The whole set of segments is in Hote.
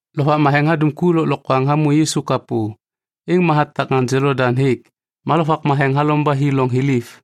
Lovak Matheŋ hadum ku lôklokwaŋ hamô Yisu kapô, êŋ ma hatak ŋaŋ Jolodaŋ hêk. Ma Lovak Matheŋ halom yani ba hi loŋ thiliv.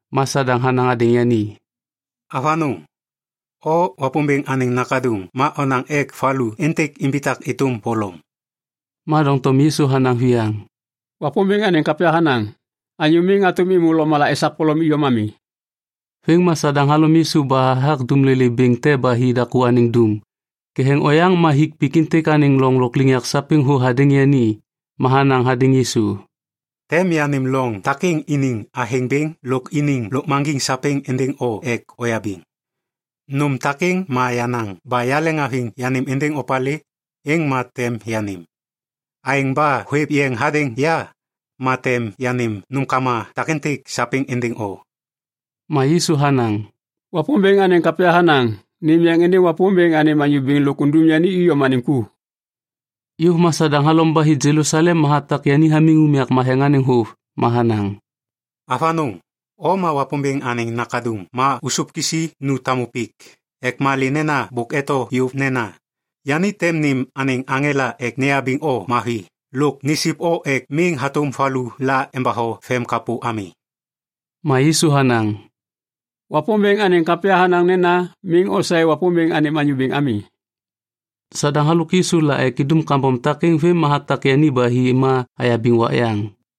Ma Sadaŋ hanaŋ hadêŋ yani, “Avanôŋ, o Wapômbêŋ anêŋ Nakaduŋ ma onaŋ ek valu êntêk imbitak êtôm polom.” Ma doŋtom Yisu hanaŋ viyaŋ, “Wapômbêŋ anêŋ kapya hanaŋ, ‘Anyô miŋ hatôm êmô lôkmala esak polom iyom ami.’” Vêm ma Sadaŋ halom Yisu ba hathak dumlolê bêŋ te ba hi daku anêŋ dum. Ketheŋ oyaŋ ma hik pik êntêk anêŋ loŋ lôkliŋyak sapêŋ thô hadêŋ yani. Ma hanaŋ hadêŋ Yisu, “Tem yanêm loŋ takêŋ iniŋ athêŋ bêŋ lôk iniŋ lôkmaŋgiŋ sapêŋ êndêŋ o ek oyabiŋ. Nôm takêŋ ma yenaŋ ba yaleŋhaviŋ yanêm êndêŋ opalê, êŋ ma tem yanêm. Aêŋ ba hôêv yeŋ hadêŋ ya, ma tem yanêm nômkama takêntêk sapêŋ êndêŋ o.” Ma Yisu hanaŋ, “Wapômbêŋ anêŋ kapya hanaŋ, ‘Nêm yeŋ êndêŋ Wapômbêŋ anêm Anyô Bêŋ lôk undum yani iyom anêŋ ku.’” Yôv ma Sadaŋ halom ba hi Jelusalem ma hatak yani hamiŋ unyak matheŋ anêŋ vôv. Ma hanaŋ, “Avanôŋ, o ma Wapômbêŋ anêŋ Nakaduŋ ma ôsôv kisi nu tamu pik ek malê nena bôk eto yôv nena, “‘Yani tem nêm anêŋ aŋela ek neyabiŋ o mavi lôk nisip o ek miŋ hatôm valu la embatho vemkapô ami.’” Ma Yisu hanaŋ, “Wapômbêŋ anêŋ kapya hanaŋ nena, ‘Miŋ osaê Wapômbêŋ anêm Anyô Bêŋ ami.’” Sadaŋ halôk Yisu la ek indum kambom takêŋ vêm ma hatak yani ba hi ma hayabiŋ wak yaŋ.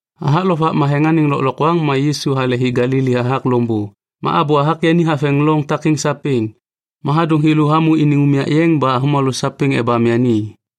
Hathak Lovak Matheŋ anêŋ lôklokwaŋ ma Yisu hale hi Galili hathak loŋbô. Ma abô hathak yani haveŋ loŋ takêŋ sapêŋ. Ma hadôŋ thêlô hamô iniŋ unyak yeŋ ba avômalô sapêŋ ebam yani.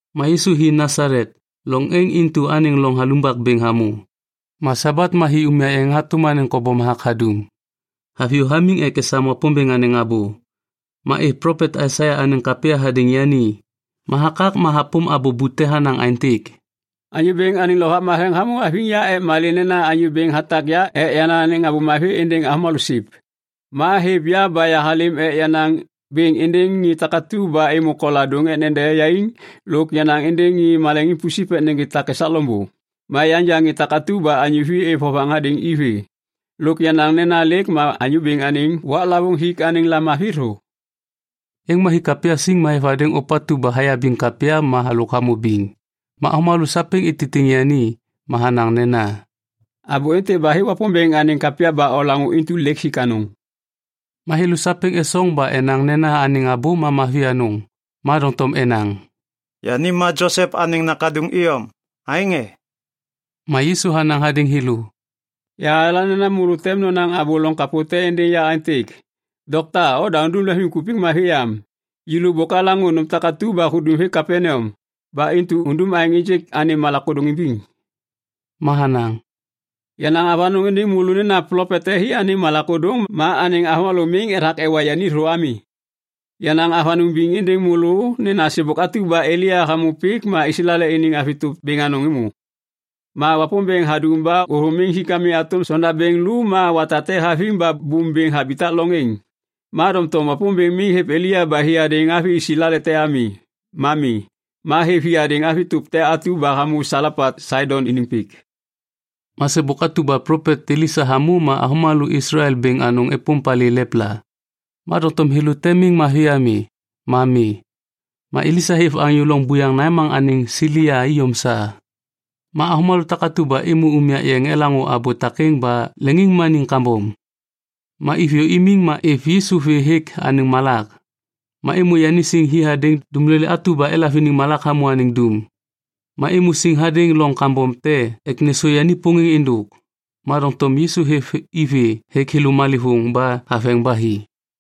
Ma Yisu hi Nasalet, loŋ êŋ intu anêŋ loŋ halumbak bêŋ hamô. Ma Sabat ma hi unyak yeŋ hatôm anêŋ kobom hathak hadum. Haviyô hamiŋ ek esam Wapômbêŋ anêŋ abô. Ma êv plopet Aisaia anêŋ kapya hadêŋ yani, ma hakak ma hapôm abô bute hanaŋ aêntêk, “Anyô Bêŋ anêŋ Lovak Matheŋ hamô haviŋ ya ek malê nena Anyô Bêŋ hatak ya ek yanaŋ anêŋ Abô Mavi êndêŋ avômalô siv. Ma hêv ya ba yahalêm ek yanaŋ bêŋ êndêŋ ŋê takatu ba êmô koladôŋ ek nede yaiŋ lôk yanaŋ êndêŋ ŋê maleŋiŋ pusip ek nêgê tak esak loŋbô ma yanja ŋê takatu ba anyô vi êv vovaŋ hadêŋ i vê lôk yanaŋ nena lêk ma Anyô Bêŋ anêŋ waklavôŋ hik anêŋ lamavi thô.” Êŋ ma hik kapya siŋ ma hêv hadêŋ ôpatu ba hayabiŋ kapya ma halôk hamô biŋ. Ma avômalô sapêŋ ititiŋ yani. Ma hanaŋ nena, “Abô êntêk ba hêk Wapômbêŋ anêŋ kapya ba olaŋô intu lêk hik anôŋ.” Ma thêlô sapêŋ esoŋ ba enaŋ nena anêŋ abô ma mavi anôŋ. Ma doŋtom enaŋ, “Yani ma Josep anêŋ nakaduŋ iyom, aêŋ e?” Ma Yisu hanaŋ hadêŋ thêlô, “Yahayala nena môlô tem nonaŋ abô loŋ kapô te êndêŋ ya aêntêk, ‘Dokta, oda undum lemvimkupik mavi am. Yêlô bôk alaŋô nôm takatu ba hudum hêk Kapaneam. Ba intu undum aêŋ ênjêk anêm malak ôdôŋ imbiŋ.’” Ma hanaŋ, “Yanaŋ avanôŋ êndêŋ môlô nena plopet te hi anêŋ malak ôdôŋ ma anêŋ avômalô miŋ ethak ewa yani thô ami. Yanaŋ avanôŋ biŋ êndêŋ môlô nena sêbôk atu ba Elia hamô pik ma Islael iniŋ avi tôp bêŋ anôŋ êmô. Ma Wapômbêŋ hadum ba ôthôm mi hatôm sondabêŋ lô ma wata te haviŋ ba bôm bêŋ habitak loŋ êŋ. Ma doŋtom Wapômbêŋ miŋ hêv Elia ba hi hadêŋ avi Islael te ami, ma mi. Ma hêv hi hadêŋ avi tôp te atu ba hamô Salepat Saidon iniŋ pik. “Ma sêbôk atu ba plopet Elisa hamô ma avômalô Islael bêŋ anôŋ êpôm palê lepla. Ma doŋtom thêlô te miŋ mavi ami, ma mi. Ma Elisa hêv anyô loŋ buyaŋ Naiman anêŋ Silia iyom sa. “Ma avômalô takatu ba êmô unyak yeŋ elaŋô abô takêŋ ba leŋiŋmaniŋ kambom. Ma iviyô imiŋ ma êv Yisu vê hêk anêŋ malak. Ma êmô yani siŋ hi hadêŋ dumlolê atu ba elav iniŋ malak hamô anêŋ dum. Ma êmô siŋ hadêŋ loŋ kambom te ek nêsô yani pôŋêŋ êndôk. Ma doŋtom Yisu hêv i vê hêk thêlô malêvôŋ ba haveŋ ba hi.”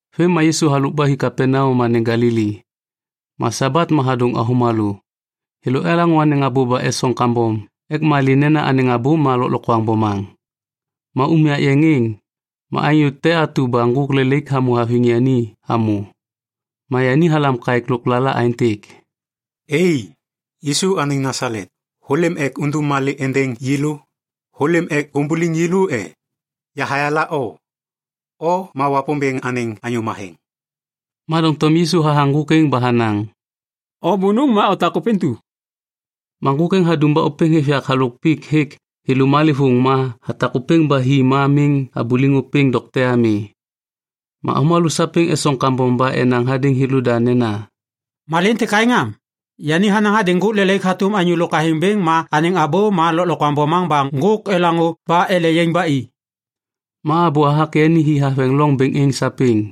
Vêm ma Yisu halôk ba hi Kapaneam anêŋ Galili. Ma Sabat ma hadôŋ avômalô. Thêlô elaŋô anêŋ abô ba esoŋ kambom ek malê nena anêŋ abô ma lôklokwaŋ bomaŋ. Ma unyak yeŋ êŋ, ma anyô te atu ba ŋgôk lelaik hamô haviŋ yani hamô. Ma yani halam kaêk lôklala aêntêk, “Ei. Yisu anêŋ Nasalet, hôlêm ek undum malê te êndêŋ yêlô? Hôlêm ek umbuliŋ yêlô e? Yahayala o. O ma Wapômbêŋ anêŋ Anyô Matheŋ.” Ma doŋtom Yisu hathaŋ ŋgôk êŋ ba hanaŋ, “O bônôŋ ma otak ôpêntu.” Ma ŋgôk êŋ hadum ba ôpêŋ hêv yak halôk pik hêk thêlô malêvôŋ ma hatak ôpêŋ ba hi ma miŋ habuliŋ ôpêŋ dokte ami. Ma avômalô sapêŋ esoŋ kambom ba enaŋ hadêŋ thêlôda nena, “Malê êntêk aêŋ am? Yani hanaŋ hadêŋ ŋgôk lelaik hatôm anyô lôk athêŋ bêŋ ma anêŋ abô ma lôklokwaŋ bomaŋ ba ŋgôk elaŋô ba ele yaiŋ ba i.” Ma abô hathak yani hi haveŋ loŋ bêŋ êŋ sapêŋ.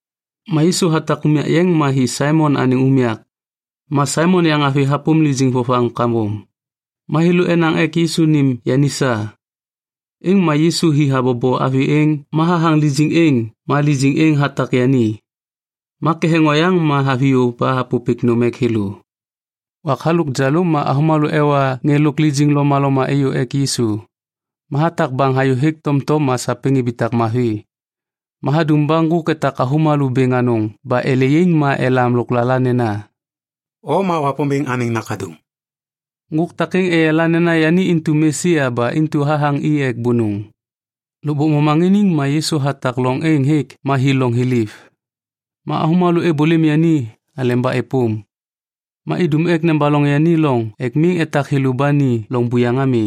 Ma Yisu hatak unyak yeŋ ma hi Saimon anêŋ unyak. Ma Saimon yaŋavi hapôm lijiŋ vovaŋ kambom. Ma thêlô enaŋ ek Yisu nêm yani sa. Êŋ ma Yisu hi habobo avi êŋ ma hathaŋ lijiŋ êŋ ma lijiŋ êŋ hatak yani. Ma ketheŋ oyaŋ ma haviyô ba hapôpêk nôm ek thêlô. Wak halôk jalôm ma avômalô ewa ŋê lôk lijiŋ lomaloma êyô ek Yisu. Ma hatak baŋ hayô hêk tomtom ma sapêŋ ibitak mavi. Ma hadum ba ŋgôk etak avômalô bêŋ anôŋ ba ele yaiŋ ma elam lôklala nena, “O ma Wapômbêŋ Anêŋ Nakaduŋ.” Ŋgôk takêŋ eyala nena yani intu Mesia ba intu hathaŋ i ek bônôŋ. Lôkbôk momaŋiniŋ ma Yisu hatak loŋ êŋ hêk ma hi loŋ thiliv. Ma avômalô êbôlêm yani aleba êpôm. Ma idum ek nebaloŋ yani loŋ ek miŋ etak thêlô ba ni loŋ buyaŋ ami.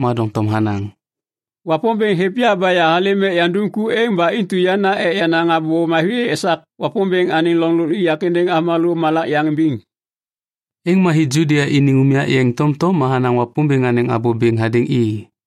Ma doŋtom hanaŋ, “Wapômbêŋ hêv ya ba yahalêm ek yandum ku êŋ ba intu yana ek yanaŋ Abô Mavi esak Wapômbêŋ anêŋ loŋ lôkliŋyak êndêŋ avômalô malak yaŋ imbiŋ.” Êŋ ma hi Judia iniŋ unyak yeŋ tomtom ma hanaŋ Wapômbêŋ anêŋ abô bêŋ hadêŋ i.